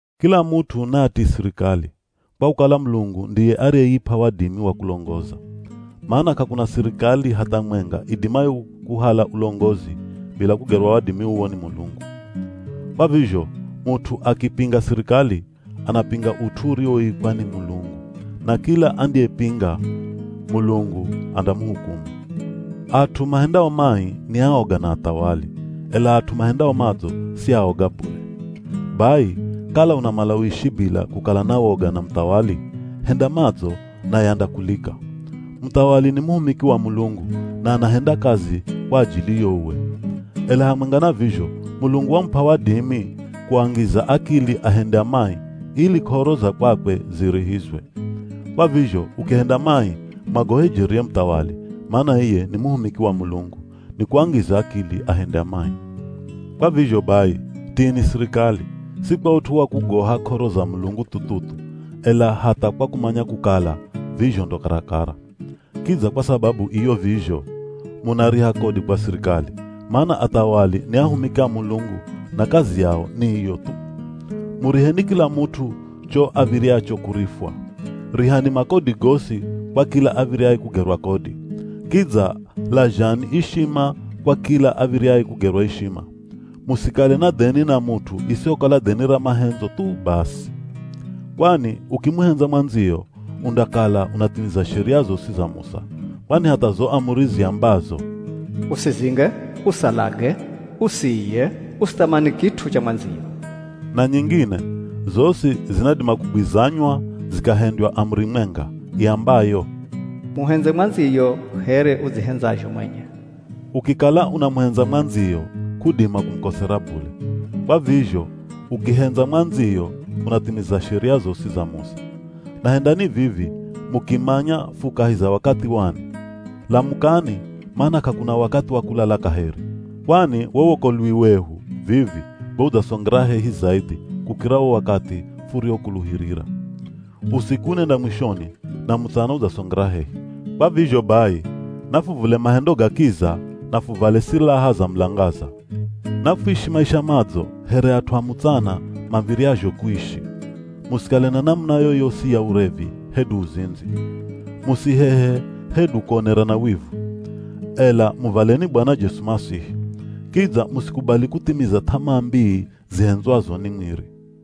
Kila mut'u naatii sirikali, kwa kukala Mulungu ndiye ariyeip'a wadimi wa kulongoza. Mana k'akuna sirikali hatha mwenga idimayo kuhala ulongozi bila kugerwa wadimi uwo ni Mulungu. Kwa vizho mut'u akipinga sirikali, anapinga ut'u uriwoikwa ni Mulungu, na kila andiyepinga, Mulungu, andamuhukumu. At'u mahendao mai ni aoga na athawali, ela at'u mahendao madzo si aoga bule. Bai kala unamala uishi bila kukala na woga na muthawali, henda madzo naye andakulika. Muthawali ni muhumiki wa Mulungu na anahenda kazi kwa ajiliyo uwe. Ela hamwenga na vizho Mulungu wamup'a wadimi kuangiza akili ahendi a mai ili k'oro za kwakwe zirihizwe. Kwa vizho ukihenda mai, mwagohe jeri ye muthawali mana iye ni muhumiki wa Mulungu, nikuangiza akili ahendi a mai. Kwa vizho bai, tiini sirikali, si kwa ut'u wa kugoha k'oro za Mulungu thu-thu-thu, ela hatha kwa kumanya kukala vizho ndo karakara. Kidza kwa sababu iyo vizho, munariha kodi kwa sirikali, mana athawali ni ahumiki a Mulungu na kazi yao ni iyo thu. Muriheni kila mut'u cho av̱iryacho kurifwa. Rihani makodi gosi kwa kila av̱iryaye kugerwa kodi. Kidza lazhani ishima kwa kila av̱iryaye kugerwa ishima. Musikale na dheni na mut'u isihokala dheni ra mahendzo thu basi. Kwani ukimuhendza mwandziyo, undakala unathimiza Sheria zosi za Musa. Kwani hatha zo amuri ziambazo, “Usizinge, usalage, usiiye, usithamani kit'u cha mwandziyo,” na nyingine, zosi zinadima kugwizanywa zikahendywa amuri mwenga, iambayo, “Muhendze mwandziyo here udzihendzazho mwenye.” Ukikala unamuhendza mwandziyo k'udima kumukosera bule. Kwa vizho ukihendza mwandziyo unathimiza Sheria zosi za Musa. Na hendani vivi mukimanya fu kahi za wakathi wani. Lamukani mana k'akuna wakathi wa kulala kaheri. Kwani wo wokolwi wehu vivi be udzasongera hehi zaidhi kukira wo wakathi furiokuluhirira. Usiku unenda mwishoni, na mutsana udzasongera hehi, kwa vizho bai, nafuvule mahendo ga kiza na fuvale silaha za mulangaza. Nafuishi maisha madzo here at'u a mutsana mav̱iryazho kuishi. Musikale na namuna yoyosi ya urevi, hedu uzindzi. Musihehe hedu kuonerana wivu. Ela muvaleni Bwana Jesu Masihi. Kidza musikubali kuthimiza th'amaa mbii zihendzwazo ni mwiri.